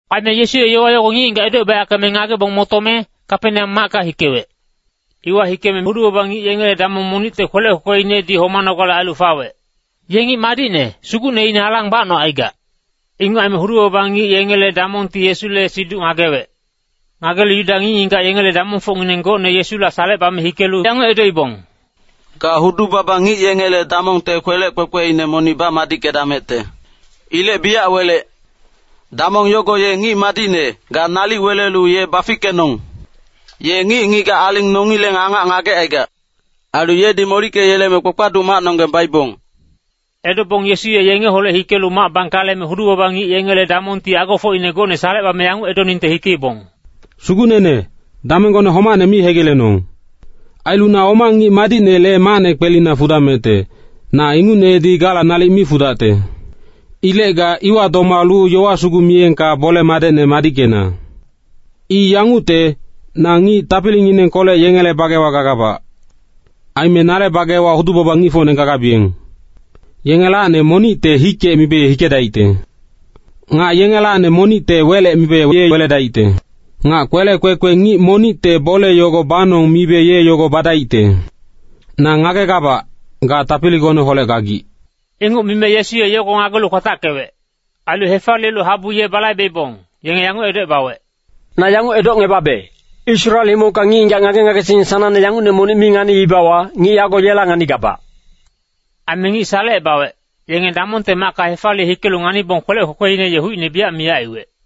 Aime Yesu ye yowa yogo ngic-ngigac edocebayackeme ngagebong motome, Kapeneam macka hikewec. Iwa hikeme hudu-baba ngic yengele damong monicte kwelec kwekweinedi homanogale ailu fawec. Ye ngic madicne, sugucneine alang bacnocaigac. Inguc aime hudu-baba ngic yengele damongti Yesule siduc ngagewec. Ngagelu Yuda ngic-ngigac yengele damongfocngineng gocne Yesula salecebame hikelu yanguc edoibong, “Ga hudu-baba ngic yengele damongte kwelec kwekweine monic bamadickedamecte. Ilec biyac welec. Damong yogo ye ngic madicne, ga nalic welelu ye bafickenong! Ye ngic-ngigac aling nongileng angac ngagecaigac. Ailu yedi molickeyeleme kpakpaduc macnonggeng baibong.” Edobong Yesu ye yengeholec hikelu mac bangkaleme, hudu-baba ngic yengele damongti agofocine gocne salecebame yanguc edoningte hikeibong, “Sugucnene, damenggone homacne mi hegilenong. Ailu na oma ngic madicnele macne kwelina fudamecte, na ingucnedi gala nalic mi fudacte. Ilec ga iwa domalu yowa sugu miyengka bole-madecne madickena. I yangucte, na ngic tapilinginengkolec yengele bagewa gagabac. Aime nale bagewa hudu-baba ngicfocne gagabiyeng. Yengelacni monicte ‘hikec’ mibe ye hikedaicte. Nga yengelacni monicte ‘welec’ mibe ye weledaicte. Nga kwelec kwekwe ngic monicte ‘bole yogo banong’ mibe ye yogo badaicte. Na ngagegabac, ga tapiligoneholec gagic.” Inguc mime Yesu ye yogo ngagelu kwatackewec. Ailu hefaliyelu habu ye balaibeibong, yenge yanguc edocebawec, “Na yanguc edocngebabe, Israel himongka ngic-ngigac ngage-ngagesingngineng sanangne yangucne monic mi nganiibawa, ngic yago yela nganigabac.” Aime ngic salecebawec, yenge damongte macka hefaliye hikelu nganibong kwelec kwekweine ye hucine miyac aiwec.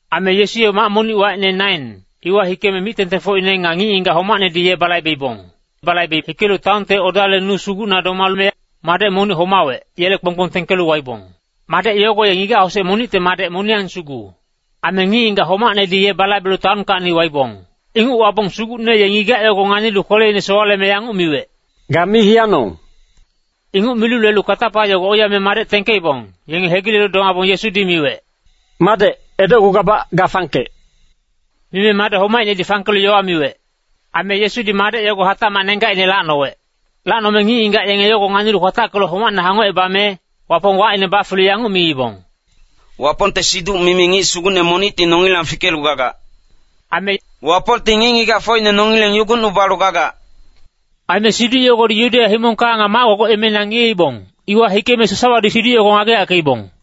Aime Yesu ye mac monic, wacine Nain, iwa hikeme mic-tengtengfocine nga ngic-ngigac homacnedi ye balaibeibong. Balaibe hikelu taonte odale nu sugucna domame, madec monic homawec, yele kponggbong tengkelu waibong. Madec yogo ye ngigac-hosec monicte madec moniyang sugu. Aime ngic-ngigac homacnedi ye balaibelu taonkacni waibong. Inguc wabong Sugucne ye ngigac yogo nganilu kweleine sowaleme yanguc miwec, “Ga mi hiyanong!” Inguc milu lelu katapa yogo oiyame madec tengkeibong, yenge hegilelu domabong Yesudi miwec, “Madec, edocgugabac, ga fangkec!” Mime madec homaicnedi fangkelu yowa miwec. Aime Yesudi madec yogo hatacmac nenggacine lacnowec. Lacnome ngic-ngigac yenge yogo nganilu kwatackelu homacne hangocebame, Wapong wacine bafelu yanguc miibong, “Wapongte siduc-mimi ngic sugucne monicti nongilang fikelu gagac.” Aime “Wapongti ngic-ngigacfocine nongileng yugucnubalu gagac.” Aime siduc yogodi Yudeya himongka nga mac-gogoc emeina ngiyeibong, iwa hikeme sasawadi siduc yogo ngageyackeibong.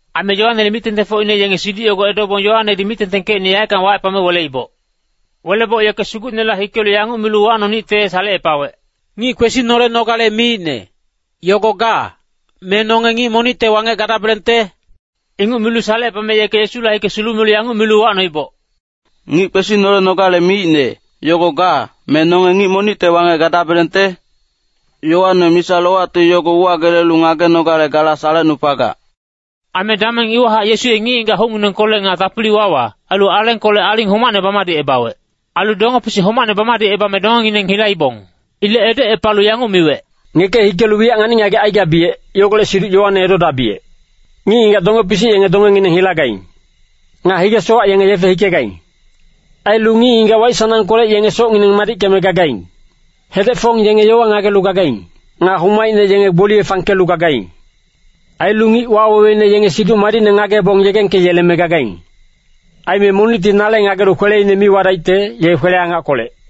Aime Yoanele mic-tengtengfocine yenge siduc yogo edobong, Yoanedi mic-tengtengkecine yaeckang wacepame weleiboc. Weleboc yeke Sugucnela hikelu yanguc milu uwacnonicte salecepawec, “Ngic kwesinolenogale miicne, yogo ga, me nonge ngic monicte wangec gadabelengte?” Inguc milu salecepame yeke Yesula hike sulumelu yanguc milu uwacnoiboc, “Ngic kwesinolenogale miicne, yogo ga, me nonge ngic monicte wangec gadabelengte? Yoane misa-lowacti yogo uwagelelu ngagenogale gala salecnupagac.” Aime dameng iwahac Yesu ye ngic-ngigac hucnginengkolec nga tapili-wawa, ailu alengkolec aling homacne bamadicebawec. Ailu donge-pisic homacne bamadicebame dongengineng hilaibong. Ilec edocepalu yanguc miwec, “Ngeke hikelu wiyac ngani-ngagec aigabiyec, yogolec siduc Yoane edodabiyec! Ngic-ngigac donge-pisic yenge dongengineng hilagaing. Nga hige-sowac yenge yefe hikegaing. Ailu ngic-ngigac waic-sanangkolec yenge socngineng madickeme gagaing. Hedec-fong yenge yowa ngagelu gagaing. Nga homaicne yenge gboliye fangkelu gagaing. Ailu ngic waweweine yenge Siduc Madicne ngagebong yegengkeyeleme gagaing. Aime monicti nale ngagelu kweleine mi wadaicte, ye kwele-angackolec.”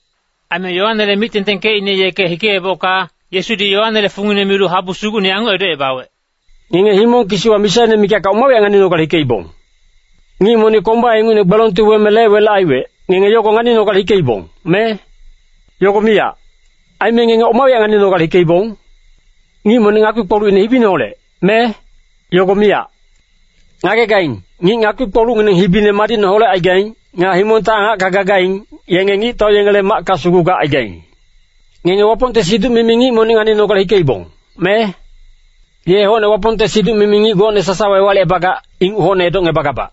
Aime Yoanele mic-tengtengkecine yeke hikeebocka, Yesudi Yoanele fungine milu habu sugucne yanguc edocebawec, “Ngenge himong kisiwa misaine mikacka oma wiyac nganinogale hikeibong? Ngic monic komba ingucne gbelongti weme lec-welec aiwec, ngenge yogo nganinogale hikeibong, me? Yogo miyac. Aime ngenge oma wiyac nganinogale hikeibong? Ngic monic ngakpi-kpolucine hibiineholec, me? Yogo miyac. Ngagegaing, ngic ngakpi-kpolucngineng hibine madicne holecaigaing, nga himongte angacka gagaing, yenge ngictau yengele macka sugu gacaigaing. Ngenge Wapongte siduc-mimi ngic monic nganinogale hikeibong, me? Ye hocne Wapongte siduc-mimi ngic gocne sasawa ewalicebagac, inguc hocne edocngebagabac.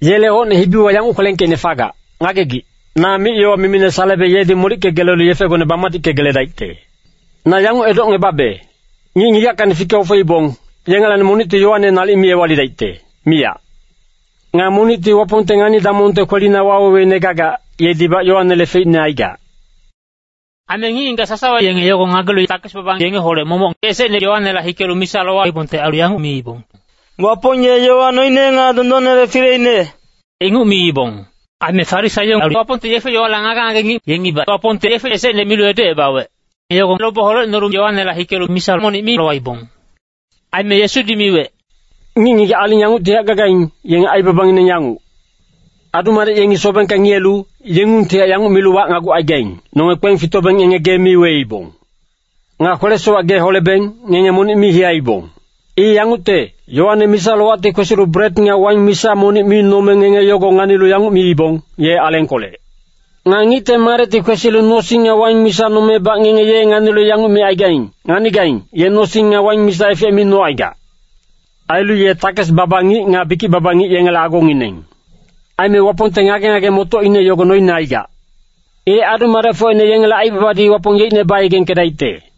Yele hocne hibiwa yanguc kwelengkeicne fagac, ‘Ngagegic, na mic-yowa mimine salebe yedi molickegelelu yefegone bamadickegeledaicte.’ Na yanguc edocngebabe, ngic-ngigackacni fike-ofeibong, yengelacni monicti Yoane nalic mi ewalidaicte, miyac. Nga monicti Wapongte ngani-damongte kwelina waweweine gagac, yedibac Yoanele feicne aigac.” Aime ngic-ngigac sasawa yenge yogo ngagelu, takes-baba yengeholec momoc, esecne Yoanela hikelu misa lowaibongte ailu yanguc miibong, “Wapong ye yowa noine nga dondonnele fileine,” inguc miibong. Aime Farisaio ailu Wapongte yefe-yowale ngage-ngage ngic, yengibac Wapongti yefe esecne milu edocebawec, yogo lobe holecnolu Yoanela hikelu misa monic mi lowaibong. Aime Yesudi miwec, “Ngic-ngigac aling yanguctihac gagaing, yenge aibabangineng yanguc. Adu-madec yengi sobengka ngiyelu, yengungtihac yanguc milu wacnagucaigaing, ‘Nonge kpeng fitobeng ngenge gee mi weibong. Nga kwele-sowac gee holebeng, ngenge monic mi hiyaibong.’ I yangucte, Yoane misa-lowacti kwesilu bret nga waing misa monic mi nome ngenge yogo nganilu yanguc miibong, ‘Ye alengkolec.’ Nga Ngicte Madecti kwesilu nosing nga waing misa nomebac ngenge ye nganilu yanguc micaigaing, ‘Nganigaing, ye nosing nga waing misa efec mi nocaigac. Ailu ye takes-baba ngic nga bikic-baba ngic yengele agongineng.’ Aime Wapongte ngage-ngage-motocine yogo noine aigac. Ilec adu-madecfocine yengele aibabadi Wapong yeicne bayegengkedaicte.”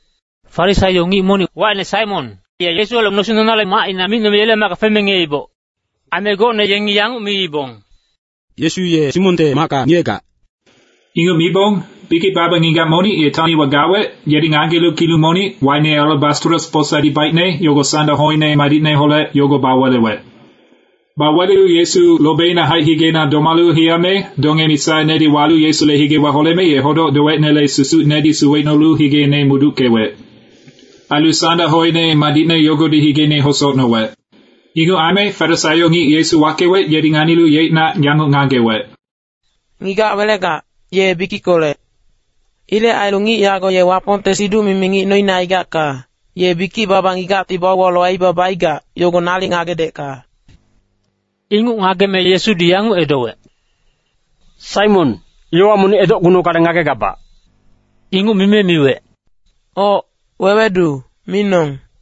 Farisaio ngic monic, wacine Saimon, ye Yesuholec nosing nonale macina micnome yele macka feme ngiyeiboc. Aime gocne yengi yanguc miibong, “Yesu ye Saimonte macka ngiyegac.” Inguc mibong bikic-baba ngigac monic ye taon iwa gawec, yedi ngagelu kilung monic, wacine alabastros posadi baicne, yogo sanda hoine madicneholec yogo bawelewec. Bawelelu Yesu lobeinahaic, higeina domalu hiyame donge-misainedi walu Yesule higewa holeme, ye hodoc-dowecinele susucinedi suwecnolu higeine muduckewec. Ailu sanda hoine madicne yogodi higeine hosocnowec. Inguc aime Farisaio ngic Yesu wackewec, yedi nganilu yeicnac yanguc ngagewec, “Ngigac welegac, ye bikickolec. Ilec ailu ngic yago ye Wapongte siduc-mimi ngic noine aigacka, ye bikic-baba ngigacti bauwalu aibaba aigac, yogo nalic ngagedecka.” Inguc ngageme Yesudi yanguc edowec, “Saimon, yowa monic edocgunogale ngagegabac.” Inguc mime miwec, “Oc, wewedu, minong.”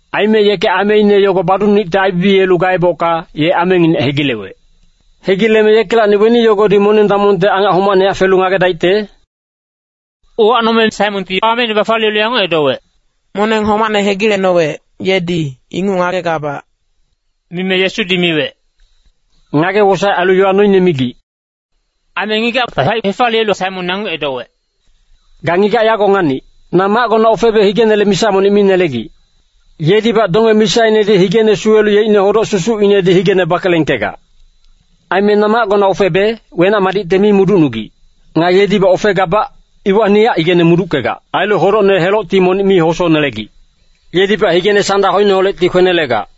Aime yeke ameine yogo baducnonicte aibibiyelu gaebocka, ye amenginec hegilewec. Hegileme yekelacni weni yogodi moneng-damongte angac homacnehac felu ngagedaicte?” Uwacnome Saimonti ameine bafaliyelu yanguc edowec, “Moneng homacne hegilecnowec, yedi, inguc ngagegabac.” Mime Yesudi miwec, “Ngage-wosaec ailu yowa noine migic.” Aime ngigacta haic hefaliyelu Saimon yanguc edowec, “Ga ngigac yago nganic! Na macgona ofebe higenele misa monic mi nelegic. Yedibac donge-misainedi higene suwelu yeicne hodoc-susucinedi higene bakelengkegac. Aime na macgona ofebe, wenac-madicte mi muducnugic. Nga yedibac ofegabac, iwacnihac higena muduckegac. Ailu hodocne helocti monic mi hosonelegic. Yedibac higene sanda hoineholecti kwenelegac.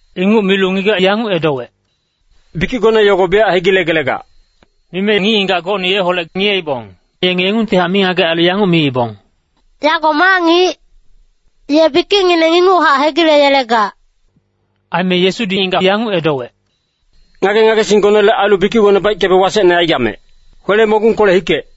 Inguc milu ngigac yanguc edowec, “Bikicgone yogo biyac hegilegelegac.” Mime ngic-ngigac gocne yeholec ngiyeibong, yenge yengungtihac mingagec ailu yanguc miibong, “Yago ma ngic? Ye bikicngineng inguchac hegileyelegac.” Aime Yesudi ngigac yanguc edowec, “Ngage-ngagesinggonele ailu bikicgone baickebe wasecne aigamec. Kwele-mogungkolec hikec!”